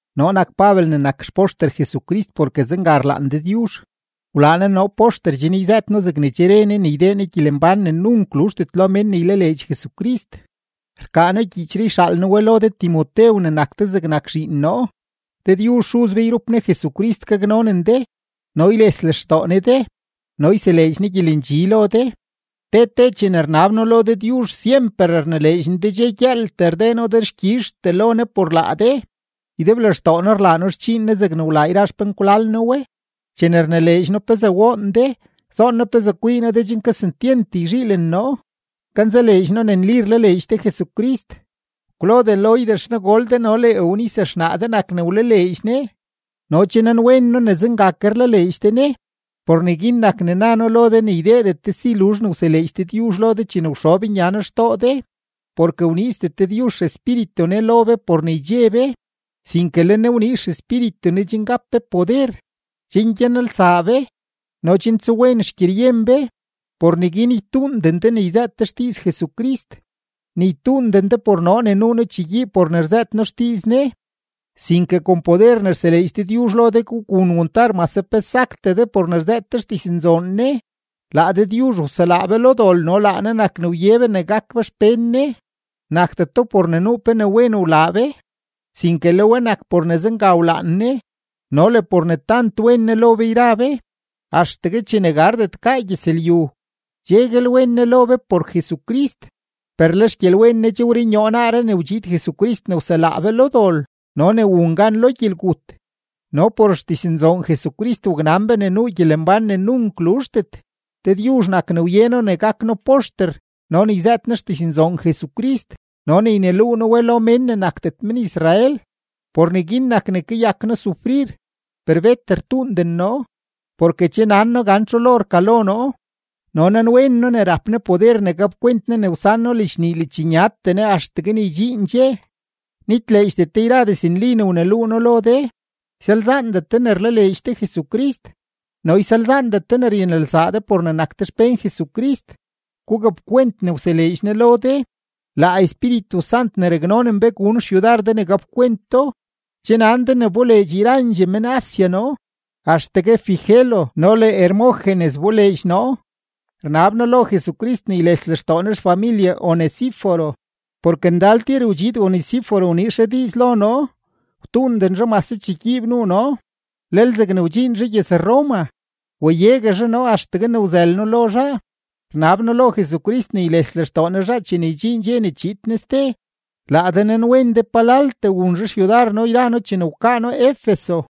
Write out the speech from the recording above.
Noo nak Pabel ne nak xpoxter Jesucrist porke zenga rlaan Dëdyuzh. Wlaa Ne noo poxter chen yzëët noo zegne che re Ne ne ydee Ne gyelembán ne nunk luzhdet lo mén ne ylaleedx Jesucrist. Rkaa noo gyiichree yxaal noo we lo de Timotew ne nak de zegnak zhiin noo. Dëdyuzh Xuz be yrup Ne Jesucrist gaknonen de no yles lextoo Ne de no yseleedx Ne gyelendxi lo de. Te te chene rnab noo lo Dëdyuzh, syemper rnileedx noo de dxe gyëëltee rdee noo dexkyizhtee lo Ne por laa de. Ydeblextoo noo rlaa noo xdxiin Ne zegne wlaa yra xpenkwlal noo we. Chene rnileedx noo pezee woon de, zoon noo pezee kwii noo de chen kesentyent yzhiilen noo. Kanzaleedx noo ne nli rlaleedx de Jesucrist. Kwlodee Loida xnagol de no le Eunice xnaa de nak ne wlaleedx Ne, no che nanwen noo ne zenga ke rlaleedx de Ne. Por neguin nak ne na noo lo de ne ydeedet de si luzh ne wseleedx Dëdyuzh lo de chene wxob nya noo xtoo de. Porke wniizdet Dëdyuzh XEspíritu Ne lo be por ne ydxe be, sinke le Ne wniiz XEspíritu Ne chen gap be poder, chen gyanelsaa be, no chen tsuwen xgyeryen be. Por neguin ytuunden de ne yzëët de xdiiz Jesucrist, ni ytuunden de por noo ne nuu noo chegyiib por ne rzëët noo xdiiz Ne, sinke kon poder ne rseleedx Dëdyuzh lo de gugun wantar mase pe saktee de por ne rzëët de xdiznzoon Ne. Laa Dëdyuzh wselaa be lo dol no laa Ne nak ne wye be ne gak be xpén Ne. Nakdeto por ne nuu pe ne wen wlaa be, sinke le we nak por ne zenga wlaan Ne no le por ne tant wen Ne lo be yra be. Axtegue chene gardet gaa gyëzlyu, cheguel wen Ne lo be por Jesucrist. Per le xgyelwen Ne che wrunyoo naaree ne wdxiid Jesucrist ne wselaa be lo dol no ne wun gan lo gyelgut, no por xdiznzoon Jesucrist waknan be ne nuu gyelembán ne nunk luzhdet. Dëdyuzh nak ne wye noo ne gak noo poxter no ne yzëët noo xdiznzoon Jesucrist no ne yneluu noo we lo mén ne nakdet men-Israel. Por neguin nak ne kayak noo sufrir, per bet rtuunden noo, porke che nan noo gan txu lo rkalo noo no nanwen noo ne rap Ne poder ne gapkwent Ne ne wsan noo ledxnii ledxnyatee Ne axtegue ne ydxiin dxe. Nitleedxdet de yra diznli ne wneluu noo lo de, ysalzaandet de ne rlaleedx de Jesucrist, no ysalzaandet de ne ryanelsaa de por ne nak de xpén Jesucrist. Gugapkwent ne wseleedx Ne lo de; laa Espíritu Sant ne raknonen be gun xyudar de ne gapkwent do. Che nan de ne wboleedx yrandxee men-Asia noo, axtegue Figelo no le Hermógenes wboleedx noo. Rnab noo lo Jesucrist ne yles lextoo Ne xfamilye Onesíforo, porke ndal tir wdxiid Onesíforo wniiz zhaa diiz lo noo, wtuunden zhaa mase chegyiib nuu noo. Lel zegne wdxiin zhaa gyëz-Roma, wayegue zhaa noo axtegue ne wzël noo lo zhaa. Rnab noo lo Jesucrist ne yles lextoo Ne zhaa chene ydxiin dxe ne chiid Ne ste. Laa de nanwen de palaltee wun zhaa xyudar noo yra noo chene wkaa noo Efeso.